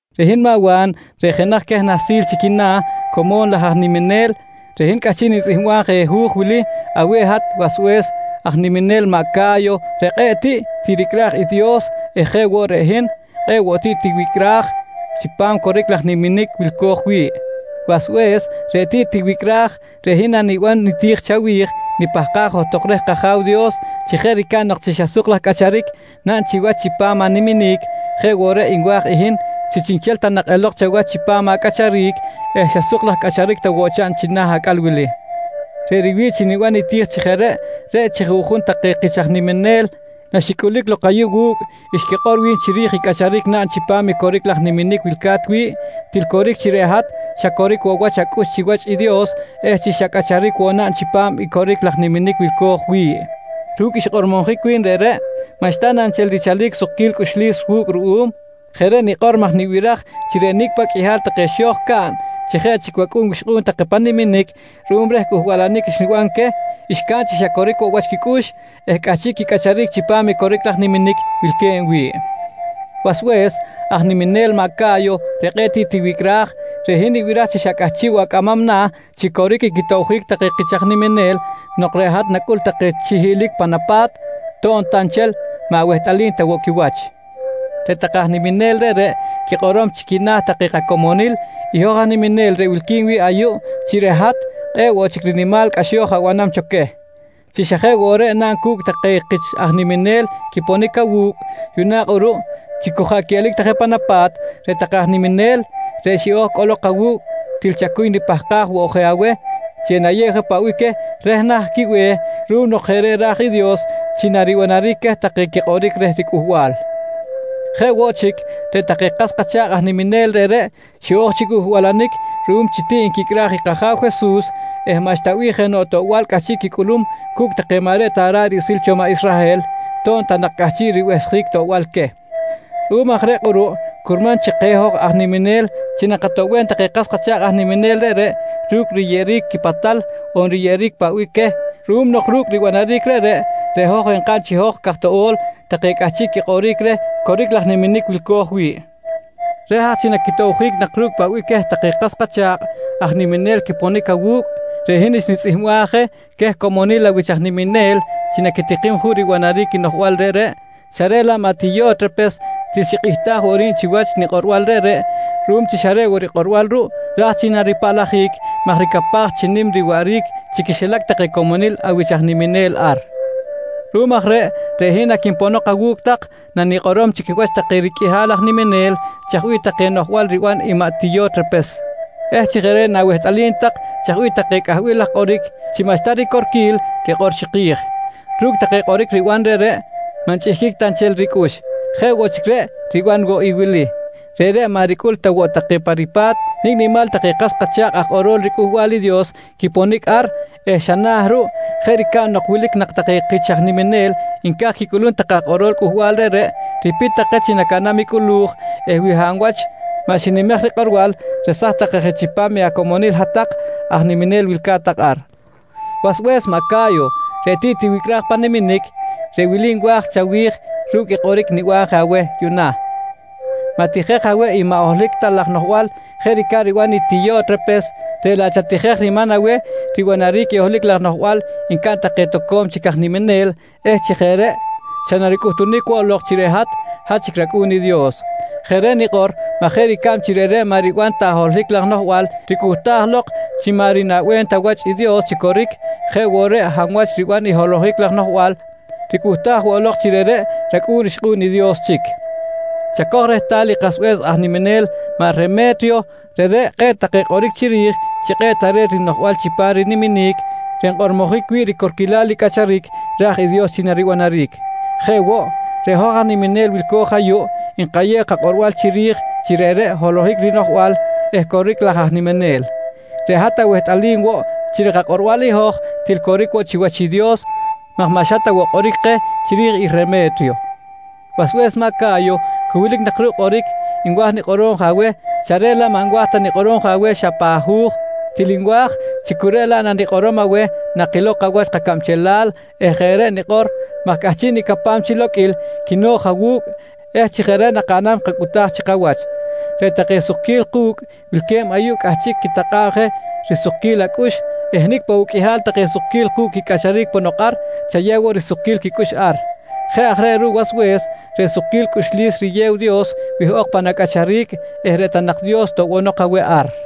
Reꞌ hin maꞌ Wa̱n reꞌ jenaj queh nahsil chi quina̱ como̱n laj aj niminel, reꞌ hin cꞌahchiꞌ nitzꞌihmbam je hu̱j wili aweh hat wasbe̱s aj niminel maꞌ Ca̱yo reꞌ kꞌe̱ꞌ tiꞌ tiricꞌraj i Dios eh jeꞌ woꞌ reꞌ hin, kꞌe̱ꞌ woꞌ tiꞌ tiwicꞌraj chipam coric laj niminic wilco̱j wi̱ꞌ. Wasbe̱s reꞌ tiꞌ tiwicꞌraj, reꞌ hin naniban niti̱j chawi̱j, nipahkaj johtok reh kAja̱w Dios chi jeꞌ ricab nok chi xa suk laj cꞌacharic naꞌn chiwach chipam animinic, jeꞌ woꞌ reꞌ nwa̱j i hin chi chiꞌnchel ta nak elok chawach chipam acꞌacharic eh xa suk laj cꞌacharic ta woꞌ chaꞌn china̱ acꞌal wili. Reꞌ riwi̱ꞌ chi niban niti̱j chi jeꞌ reꞌ, reꞌ chi juꞌjun take kich aj niminel naxicꞌulic lok ayuꞌ wu̱cꞌ xquikꞌor wi̱n chiri̱j i cꞌacharic naꞌn chipam i coric laj niminic wilca̱t wi̱ꞌ, til coric chi reꞌ hat xa coric woꞌ wach acꞌux chiwach i Dios eh chi xa cꞌacharic woꞌ naꞌn chipam i coric laj niminic wilco̱j wi̱ꞌ. Ru̱cꞌ xkꞌormojic wi̱n reꞌreꞌ, maꞌxta na nchel richalic sukquil cꞌuxlis wu̱cꞌ ruꞌum? Jeꞌ reꞌ nikꞌor maj nibiraj chi reꞌ nicꞌ paꞌ qꞌuihal take xo̱j caꞌn chi jeꞌ chic wacꞌu̱n wixkꞌu̱n take pan niminic ruꞌum reh cꞌuhbalanic xniban queh, xcaꞌn chi xa coric woꞌ wach quicꞌux eh cꞌahchiꞌ quicꞌacharic chipam i coric laj niminic wilque̱b wi̱ꞌ. Wasbe̱s aj niminel maꞌ Ca̱yo reꞌ tiꞌ tiwicꞌraj, reꞌ hin nibiraj chi xa cꞌahchiꞌ woꞌ acꞌamam na̱ chi coric i quitobjic take kich aj niminel nok reꞌ hat nacꞌul take chi hiꞌlic pan apa̱t to̱b ta nchel maꞌ awehtꞌalim ta woꞌ quiwach. Reꞌ take aj niminel reꞌreꞌ quikꞌorom chi quina̱ take kacomonil i hoj aj niminel reꞌ wilqui̱n wi̱ꞌ ayuꞌ chi reꞌ hat kꞌe̱ꞌ woꞌ chic rinimal cꞌaxo̱j abanam cho queh. Chi xa jeꞌ woꞌ reꞌ naꞌn cu̱cꞌ take kich aj niminel quiponic awu̱cꞌ, yuꞌna kꞌuruꞌ chi cu jaꞌ quiꞌelic ta je pan apa̱t take aj niminel reꞌ xiꞌo̱j cꞌolok awu̱cꞌ til chacuy nipahkaj woꞌ je aweh chi enayew je paꞌ bih queh reh nah quibe̱h ruꞌum nok jeꞌ reꞌ ra̱j i Dios chi naribanaric queh take quikꞌoric reh riCꞌuhbal. Jeꞌ woꞌ chic, reꞌ take kas kacha̱kꞌ aj niminel reꞌreꞌ xiꞌo̱j chi cꞌuhbalanic ruꞌum chi tiꞌ nquicꞌraj i kAja̱w Jesus eh maꞌxta bih jenoꞌ toꞌbal cꞌahchiꞌ quicꞌulum cu̱cꞌ take maꞌ reꞌ ta ra̱ꞌ riꞌsil cho maꞌ Israhel, to̱b ta nak cꞌahchiꞌ ribehsjic toꞌbal queh. Ruꞌum aj reꞌ kꞌuruꞌ curman chi keh hoj aj niminel chi nakatoꞌbem take kas kacha̱kꞌ aj niminel reꞌreꞌ ru̱cꞌ riyeꞌeric quipatal on riyeꞌeric paꞌ bih queh ruꞌum nok ru̱cꞌ ribanaric reꞌreꞌ, reꞌ hoj enkaꞌn chi hoj caj toꞌo̱l take cꞌahchiꞌ quikꞌoric reh coric laj niminic wilco̱j wi̱ꞌ. Reh aj chi naquitobjic nak ru̱cꞌ paꞌ bih queh take kas kacha̱kꞌ aj niminel quiponic awu̱cꞌ, reꞌ hin xnitzꞌihmbaj je queh comonil awich aj niminel chi naquitikim juꞌ ribanaric i noꞌjbal reꞌreꞌ, xa reꞌ laꞌ maꞌ Tiyo̱trepes til xikꞌihtaj woꞌ ri̱b chiwach nikꞌorbal reꞌreꞌ ruꞌum chi xa reꞌ woꞌ rikꞌorbal ruꞌ ra̱j chi naripaꞌlajic maj ricapaj chi nim riwaꞌric chi quixilac take comonil awich aj niminel ar. Ruꞌum aj reꞌ, reꞌ hin naquinponok awu̱cꞌ tak nanikꞌorom chi quiwach take riqꞌuihal aj niminel chaj bih take noꞌjbal riban i maꞌ Tiyo̱trepes eh chi jeꞌ reꞌ na̱wehtꞌalim tak chaj bih take cꞌahbil laj kꞌoric chi maꞌxta ricorquil rikꞌor chiki̱j. Ru̱cꞌ take kꞌoric riban reꞌreꞌ maꞌ nchꞌihquic ta nchel ricꞌux. Jeꞌ woꞌ chic reꞌ riban woꞌ i wili: Reꞌreꞌ maꞌ ricꞌul ta woꞌ take pa ripa̱t nicꞌ nimal take kas kacha̱kꞌ aj kꞌorol riCꞌuhbal i Dios quiponic ar eh xa na̱ ruꞌ jeꞌ ricab nok wilic nak take kich aj niminel nca̱j quicꞌulum take aj kꞌorol cꞌuhbal reꞌreꞌ, ripit take chi nacaꞌnam i cꞌulu̱j eh wi hab wach maꞌ xinimej rikꞌorbal, resaj take je chipam i acomonil hat-tak aj niminel wilca̱t ar. Wasbe̱s maꞌ Ca̱yo reꞌ tiꞌ tiwicꞌraj pan niminic, reꞌ wili nwa̱j chawi̱j ru̱cꞌ i kꞌoric niban je aweh yuꞌna: Ma̱tijej aweh i maꞌ holohic ta laj noꞌjbal jeꞌ ricab riban i Tiyo̱trepes reꞌ laꞌ chatijej riman aweh ribanaric i holohic laj noꞌjbal ncaꞌn take toco̱m chic aj niminel eh chi jeꞌ reꞌ xa naricꞌuhtunic woꞌ lok chi reꞌ hat, hat chic racꞌu̱n i Dios. Jeꞌ reꞌ nikꞌor maj jeꞌ ricab chi reꞌreꞌ maꞌ riban ta holohic laj noꞌjbal ricꞌuhtaj lok chi maꞌ rinaꞌbem ta wach i Dios chi coric, jeꞌ woꞌ reꞌ hab wach riban i holohic laj noꞌjbal ricꞌuhtaj woꞌ lok chi reꞌreꞌ racꞌu̱n rixkꞌu̱n i Dios chic. Chacoj rehtal i kasbe̱s aj niminel maꞌ Reme̱triyo, reꞌreꞌ kꞌe̱ꞌ take quikꞌoric chiri̱j chi kꞌe̱ꞌ tare̱t rinoꞌjbal chipam riniminic reꞌ nkꞌormojic wi̱ꞌ ricorquilal i cꞌacharic raj i Dios chi naribanaric. Jeꞌ woꞌ, reꞌ hoj aj niminel wilco̱j ayuꞌ nkayew kakꞌorbal chiri̱j chi reꞌreꞌ holohic rinoꞌjbal eh coric laj aj niminel. Reꞌ hat awehtꞌalim woꞌ chi reꞌ kakꞌorbal i hoj til coric woꞌ chiwach i Dios maj maꞌ xa ta woꞌ kꞌoric keh chiri̱j i Reme̱triyo. Wasbe̱s maꞌ Ca̱yo, cu wilic nak ruꞌ kꞌoric nwa̱j nikꞌorom aweh xa reꞌ laꞌ maꞌ nwa̱j ta nikꞌorom je aweh xa pan hu̱j, til nwa̱j chi cu reꞌ laꞌ nanikꞌorom aweh nakilow kawach kacabchelal eh jeꞌ reꞌ nikꞌor maj cꞌahchiꞌ nicapam chi loqꞌuil quino̱j awu̱cꞌ eh chi jeꞌ reꞌ nakaꞌnam kacꞌutaj chi kawach. Reꞌ take sukquil ku̱cꞌ wilque̱b ayuꞌ cꞌahchiꞌ quitakꞌa̱b je risukquil acꞌux eh nicꞌ paꞌ woꞌ qꞌuihal take sukquil ku̱cꞌ quicꞌacharic ponok ar, chayew woꞌ risukquil quicꞌux ar. Jeꞌ aj reꞌ ruꞌ wasbe̱s, reꞌ sukquil cꞌuxlis riyew i Dios wihꞌok pan acꞌacharic eh reꞌ ta nak Dios toꞌbonok aweh ar.